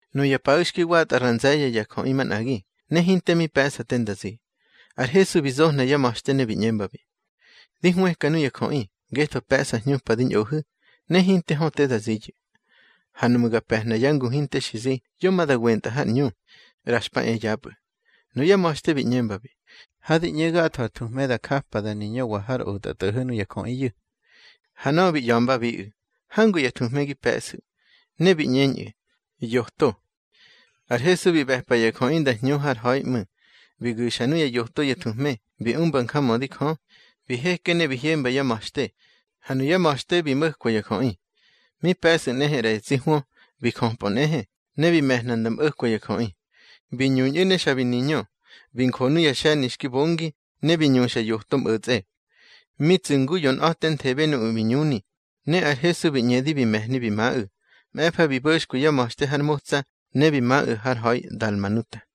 Nuya paꞌu̱ xki watꞌa ra nze̱ye̱ ya jöꞌi manꞌagi, ne hinte mi pe̱ꞌsa te nda zi. Ar Hesu bi zohna yá ma̱xte ne bi ꞌñembabi: —Di hwëka nuya jöꞌi, ngetho pe̱ꞌsa hñupa di ñꞌohu̱, ne hinte hö te da ziyu̱. Ha nuꞌmu̱ ga pe̱hna yá ngu hinte xi zi, yo ma da wentꞌa har ꞌñu, ꞌra xpa e yapꞌu̱. Nuyá ma̱xte bi ꞌñembabi: —Ha di ꞌñe gatho ar thuhme da japa da niñöwa har otꞌatꞌo̱ho̱ nuya jöꞌiyu̱. Ha nöꞌö bi ꞌya̱mbabiꞌu̱: —Hangu ya thuhme gi pe̱ꞌsu̱. Ne bi ꞌñeñꞌu̱: —Yoto. Ar Hesu bi ꞌbe̱pa ya jöꞌi nda hñu har ha̱i ꞌmu̱. Bi gu̱xa nuya yoto ya thuhme, bi umba njamödi Jö. Bi heke ne bi hyemba yá ma̱xte, ha nuyá ma̱xte bi mo̱kwa ya jöꞌi. Mi pe̱sꞌu̱ nꞌehe ꞌra ya tsi hwö. Bi jöpꞌö nꞌehe, ne bi me̱hna nda mꞌo̱kwa ya jöꞌi. Bi ñuñꞌu̱ ne xa bi niñö. Bi njo nuya xe̱ni xki bongi, ne bi ñuxa yoto mꞌo̱tsꞌe. Mi tsu̱ ngu yonꞌa̱tenthebe nuꞌu̱ bi ñuni, ne ar Hesu bi ꞌñedi bi me̱hni bi maꞌu̱. Mꞌe̱fa bi bo̱xkwi yá ma̱xte har motsa, ne bi maꞌu̱ har ha̱i Dalmanuta.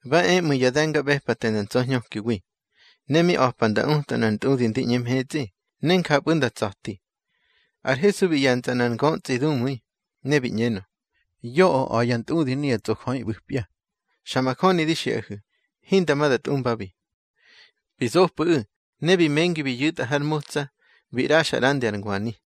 Ba e ꞌmu̱ ya de̱ngaꞌbe̱pate nda ntsa̱hñökiwi, ne mi a̱pa nda uta nꞌar ntꞌudi ndi ꞌñe mhetsꞌi, ne njapꞌu̱ nda tsa̱ti. Ar Hesu bi ꞌye̱ntsꞌa nꞌar ngötsꞌi dumu̱i, ne bi ꞌñenö: —Yoꞌö a̱ ya ntꞌudi nuya tsꞌojöꞌi ꞌbu̱pya. Xa majöni di xiꞌahu̱, hinda ma da tꞌumbabi. Bi zopꞌu̱ꞌu̱, ne bi mengi bi yu̱tꞌa har motsa, bi ꞌraxa ꞌrandi ar ngwani.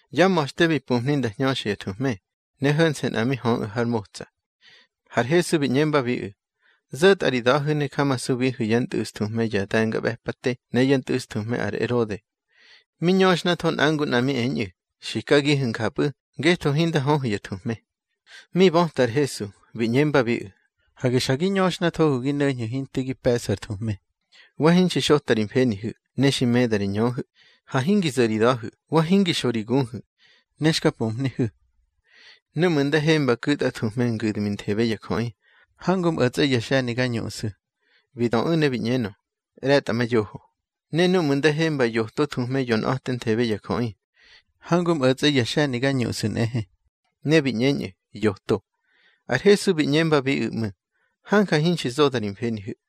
Yá ma̱xte bi pumhni nda hñöxa ya thuhme, ne ho̱nse̱ nꞌa mi höꞌu̱ har motsa. Har Hesu bi ꞌñembabiꞌu̱: —Zo̱tꞌa ri da̱hu̱ ne jamasubihu̱ yá ntꞌu̱sthuhme ya de̱ngaꞌbe̱pate ne yá ntꞌu̱sthuhme ar Erode. Mi ñöxhnatho nꞌa ngu nꞌa mi eñꞌu̱: —Xikagihu̱ njapꞌu̱ ngetho hinda höhu̱ ya thuhme. Mi böta ar Hesu, bi ꞌñembabiꞌu̱: —Hage xa gi ñöxnathohu̱ gi no̱ñhu̱ hinte gi pe̱ꞌsu̱ ar thuhme. Wa hinxi xota ri mfenihu̱, ne xi meda ri ñöhu̱. Ha hingi zo̱ ri da̱hu̱, wa hingi xo ri guhu̱, ne xka pumhnihu̱. Núꞌmu̱ nda hemba ku̱tꞌa thuhme ngu̱dminthebe ya jöꞌi, hangu mꞌo̱tsꞌe ya xe̱ni ga ñuꞌsu̱. Bi döꞌu̱ ne bi ꞌñenö: —ꞌRe̱tꞌamayoho. —Ne núꞌmu̱ nda hemba yoto thuhme yonꞌa̱tenthebe ya jöꞌi, hangu mꞌo̱tsꞌe ya xe̱ni ga ñuꞌsu̱ nꞌehe. Ne bi ꞌñeñꞌu̱: —Yoto. Ar Hesu bi ꞌñembabiꞌu̱ ꞌmu̱: —Hanja hinxi zoda ri mfenihu̱.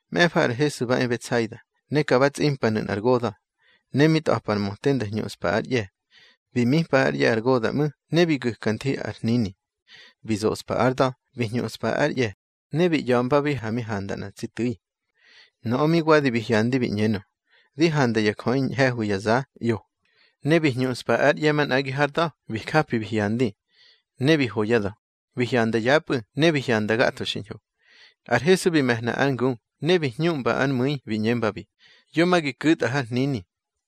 Mꞌe̱fa ar Hesu ba e Betsaida, ne ka ba tsꞌimpanu̱ nꞌar goda̱, ne mi tꞌa̱pa ar möte nda hñuꞌspa ár ꞌye̱. Bi mipa ár ꞌye̱ ar goda̱ ꞌmu̱, ne bi gu̱ka nthi ar hnini. Bi zospa ár da̱, bi hñuꞌspa ár ꞌye̱, ne bi ꞌya̱mbabi ha mi handa nꞌa tsi tu̱i. Nöꞌö mi wadi bi hyandi bi ꞌñenö: —Di handa ya jöꞌi ñhe̱hwi ya za, ꞌyo. Ne bi hñuꞌspa ár ꞌye̱ manꞌagi hár da̱, bi japi bi hyandi. Ne bi ho yá da̱, bi hyanda yapꞌu̱, ne bi hyanda gatho xiñho. Ar Hesu bi me̱hna ár ngu, ne bi hñuꞌmba ár mu̱i bi ꞌñembabi: —Yo ma gi ku̱tꞌa har hnini.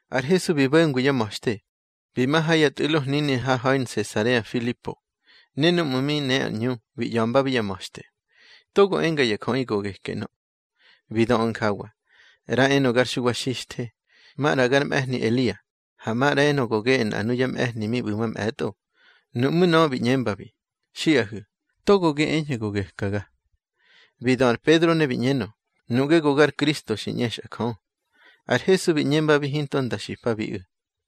Ar Hesu bi bo̱ngwi yá ma̱xte, bi ma ha ya tꞌu̱lo hnini har ha̱i Nsesarea Filipo. Ne núꞌmu̱ mi ne ar ꞌñu, bi ꞌya̱mbabi yá ma̱xte: —Togo enga ya jöꞌi go geke ꞌnö. Bi döꞌu̱ njawa: —ꞌRa enö gar Xuwa Xixthe, maꞌra gar mꞌe̱hni Elia, ha maꞌra enö go geꞌe nꞌa nuya mꞌe̱hni mi ꞌbu̱ mamꞌe̱tꞌo. Nuꞌmú̱ nöꞌö bi ꞌñembabi: —Xiꞌahu̱, togo gi eñhu̱ go gekaga. Bi dö ar Pedro ne bi ꞌñenö: —Nuꞌge go gar Kristo xi ꞌñexꞌa Jö. Ar Hesu bi ꞌñembabi hinto nda xipabiꞌu̱.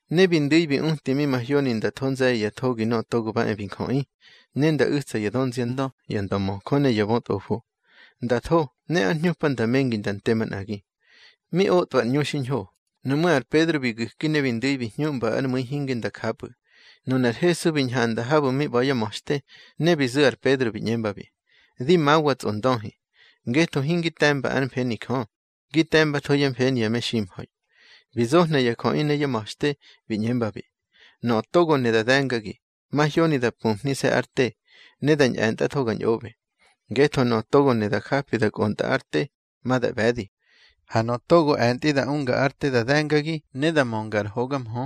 Ne bi ndu̱i bi uti mi mahyoni nda tho nze̱ye̱ ya thogi Nöꞌö Togo ba e bi Njöꞌi. Ne nda u̱tsa ya dönziandö, ya ndömöjö ne ya bötꞌofo. Nda tho, ne ár hñupa nda mengi nda nte manꞌagi. Mi otꞌwa ar ꞌñu xiñho. Nuꞌmú̱ ar Pedro bi gu̱ki ne bi ndu̱i bi hñuꞌmba ár mu̱i hinge nda japꞌu̱. Nunar Hesu bi ñhanda habu̱ mi ꞌba̱ yá ma̱xte, ne bi zu̱ ar Pedro bi ꞌñembabi: —Di mawa, tsꞌondöhi. Ngetho hingi te̱mba ár mfeni Jö, gi te̱mbatho yá mfeni ya meximha̱i. Bi zohna ya jöꞌi ne yá ma̱xte, bi ꞌñembabi: —Nöꞌö togo ne da de̱ngagi, mahyoni da pumhnise̱ ár te, ne da ñꞌe̱ntꞌatho ga ñꞌoꞌbe. Ngetho nöꞌö togo ne da japi da kꞌontꞌa ár te, ma da ꞌbe̱di. Ha nöꞌö togo e̱ntꞌi da unga ár te da de̱ngagi ne da mönga ar hoga mhö,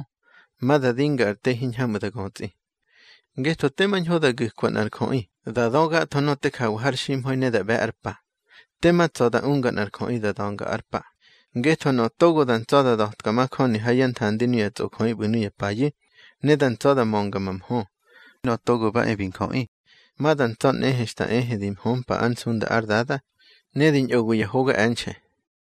ma da dinga ar te hiñhamꞌu̱ da götsꞌi. Ngetho tema ñho da gu̱kwa nꞌar jöꞌi, da dö gatho nöꞌö te jawa har ximha̱i ne da ꞌbe̱ ár pa. Tema tsa̱ da unga nꞌar jöꞌi da da̱nga ár pa. Ngetho nöꞌö togo da ntsa̱ da da̱tka majöni ha yá nthandi nuya tsꞌojöꞌi ꞌbu̱ nuya payu̱, ne da ntsa̱ da mömga ma mhö, Nöꞌö Togo ba e bi Njöꞌi ma da ntsa̱ nꞌehe xta ehe di hömpa ár nsunda ár Dada, ne di ñꞌowi ya hoga e̱nxe̱.